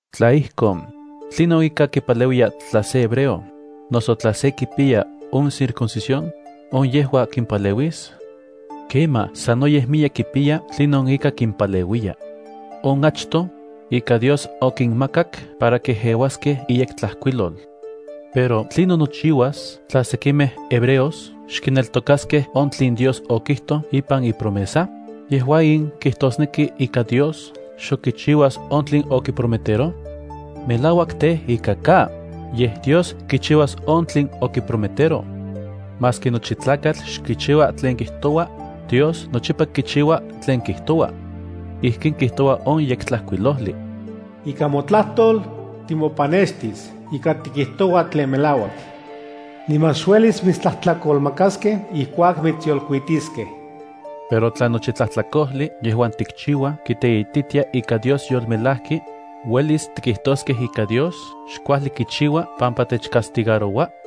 Tla ijkon, ¿tlinon ika kipaleuiya tla se hebreo, noso tla se kipiya on circuncisión? ¿On yejua kimpaleuis? Kemaj, sanoyej miyek kipiya tlinon ika kimpaleuiya. On achtoj ika Dios okinmakak para kejeuaskej iYektlajkuilol. Pero ¿tlinon nochiuas tla sekimej hebreos xkineltokaskej on tlen Dios okijtoj ipan ipromesa? ¿Yejua in kijtosneki ika Dios xok kichiuas on tlen okiprometeroj? ¡Melauak tej ika ka! Yej Dios kichiuas on tlen okiprometeroj. Maski nochi tlakatl xkichiua tlen kijtoua, Dios nochipa kichiua tlen kijtoua. Ijkin kijtoua on Yektlajkuilojli: Ika motlajtol, timopanextis ika tikijtoua tlen melaua. Niman xuelis mitstlajtlakolmakaskej ijkuak mitsyolkuitiskej. Pero tla nochi tlajtlakojli yejuan tikchiuaj kiteititia ika Dios yolmelajki, ¿uelis tikijtoskej ika Dios xkuajli kichiua pampa techcastigaroua?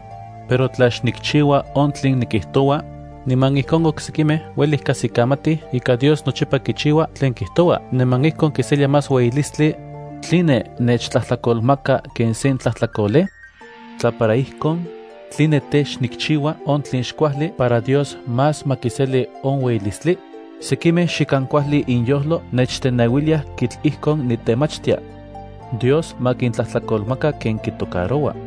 Pero tla xnikchiua on tlen nikijtoua, niman ijkon oksekimej ueli kajsikamatij ika Dios nochipa kichiua tlen kijtoua niman ijkon kiselia más ueyilislti, ¿tline nechtlajtlakolmaka ken sen tlajtlakolej? Tla para ijkon, ¿tline tej, xnikchiua on tlen xkuajli para Dios más ma kiseli on ueyilistli? Sekimej xikan kuajli inyojlo nechteneuiliaj kitl ijkon nitemachtia. Dios ma kintlajtlakolmaka ken kitocaroua.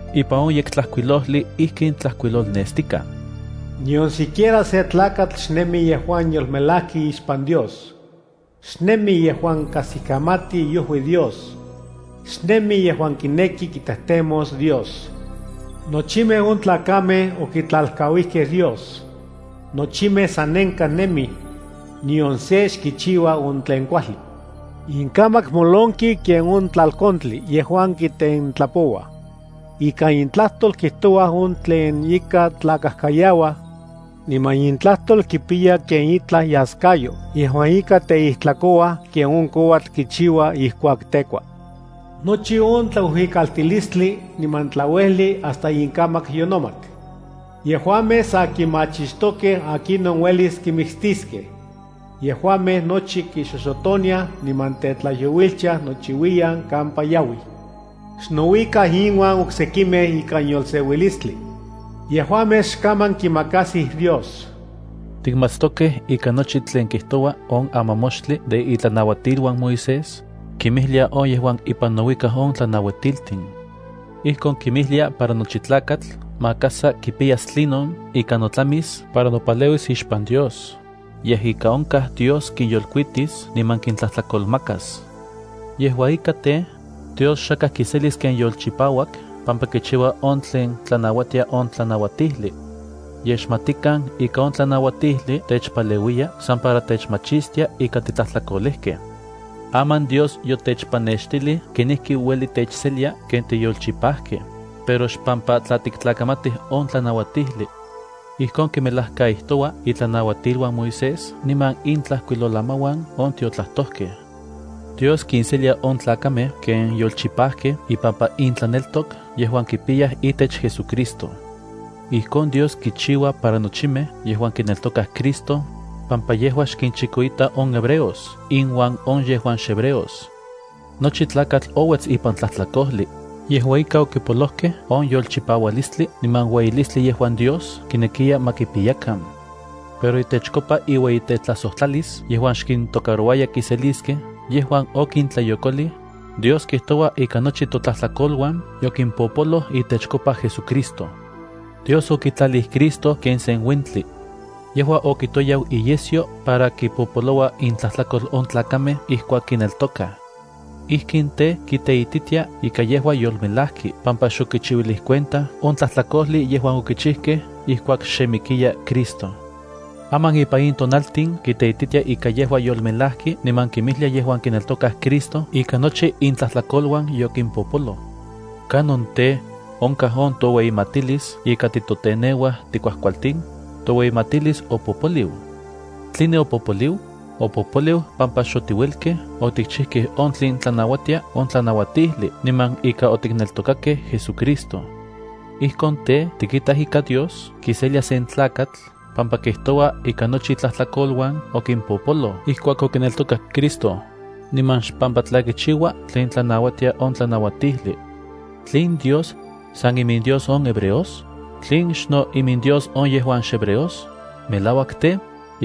Ipan on Yektlajkuilojli ijkin tlajkuilolnestikaj: Nion siquiera se tlakatl xnemi yejuan yolmelajki ixpan Dios. Xnemi yejuan kajsikamati iojui Dios; xnemi yejuan kineki kitejtemos Dios. Nochimej on tlakamej okitlalkauijkej Dios; nochimej sanenkaj nemij. Nion se xkichiua on tlen kuajli. Inkamak molonki ken on tlalkontli yejuan kitentlapouaj. Ikan intlajtol kijtouaj on tlen ika tlakajkayauaj. Niman intlajtol kipiya ken itlaj iaskayo yejuan ika teijtlakouaj ken on kouatl kichiua ijkuak tekua. Nochi on tlauijuikaltilistli niman tlauejli hasta inkamak yonomat. Yejuamej sa kimachixtokej akinon uelis kimiktiskej. Yejuamej nochi kixoxotoniaj, niman tetlajyouiltiaj nochiuiyan kampa yauij. Xnouikaj inuan oksekimej ikan yolseuilistli. Yejuamej xkaman kimakasij Dios. Tikmatstokej ika nochi tlen kijtoua on amamoxtli de itlanauatiluan Moisés, kinmijlia on yejuan ipan nouikaj on tlanauatiltin. Ijkon kinmijlia para nochi tlakatl maka sa kipiyas tlinon ika notlamis para nopaleuis ixpan Dios, yej ika onkaj Dios kinyolkuitis niman kintlajtlakolmakas. Yejua ika tej, Dios xakaj kiselis ken yolchipauak pampa kichiua on tlen tlanauatia on tlanauatijli. Yej, xmatikan ika on tlanauatijli techpaleuiya san para techmachistia ika titlajtlakolejkej. Aman, Dios yotechpanextilij kenijki ueli techselia ken tiyolchipajkej, pero xpampa tla tiktlakamatij on tlanauatijli. Ijkon kimelajkaijtoua itlanauatiluan Moisés niman intlajkuilolamauan on tiotlajtojkej. Dios kinselia on tlakamej ken yolchipajkej ipampa intlaneltok yejuan kipiyaj itech JesuCristo. Ijkon Dios kichiua para nochimej yejuan kineltokaj Cristo, pampa yejua xkinchikoita on hebreos inuan on yejuan xhebreos. Nochi tlakatl ouets ipan tlajtlakojli, yejua ika okipolojkej on yolchipaualistli niman ueyilistli yejuan Dios kinekiya ma kipiyakan. Pero itechkopa iueyitetlajsojtlalis yejuan xkintocarouaya kiseliskej yejuan okintlayokolij, Dios kijtoua ika nochi totlajtlakoluan yokimpopoloj itechkopa JesuCristo. Dios okitlalij Cristo ken se uentli. Yejua okitoyau iyesyo para kimpopolouilia intlajtlakol on tlakamej ijkuak kineltokaj. Ijkin tej, kiteititia ika yejua yolmelajki pampa xokichiuilij cuenta on tlajtlakojli yejuan okichijkej ijkuak xe mikiya Cristo. Aman ipan in tonaltin kiteititia ika yejua yolmelajki niman kinmijlia yejuan kineltokaj Cristo ika nochi intlajtlakoluan yokimpopoloj. ¿Kanon tej, onkaj on toueyimatilis ika titoteneuaj tikuajkualtin? Toueyimatilis opopoliu. ¿Tline opopoliu? Opopoliu pampa xotiuelkej otikchijkej on tlen tlanauatia on tlanauatijli niman ika otikneltokakej JesuCristo. Ijkon tej, tikitaj ika Dios kiselia sen tlakatl pampa kijtoua ika nochi itlajtlakoluan okimpopoloj ijkuak okineltokak Cristo, niman xpampa tla kichiua tlen tlanauatia on tlanauatijli. ¿Tlen Dios san iminDios on hebreos? ¿Tlen xno iminDios on yejuan xhebreos? Melauak tej,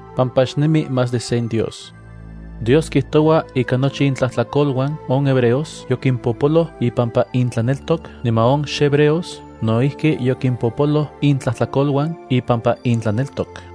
pampa xnemi más de sen Dios. Dios kijtoua ika nochi intlajtlakoluan on hebreos yokimpopoloj ipampa intlaneltok niman on xhebreos no ijki yokimpopoloj intlajtlalokan ipampa intlaneltok.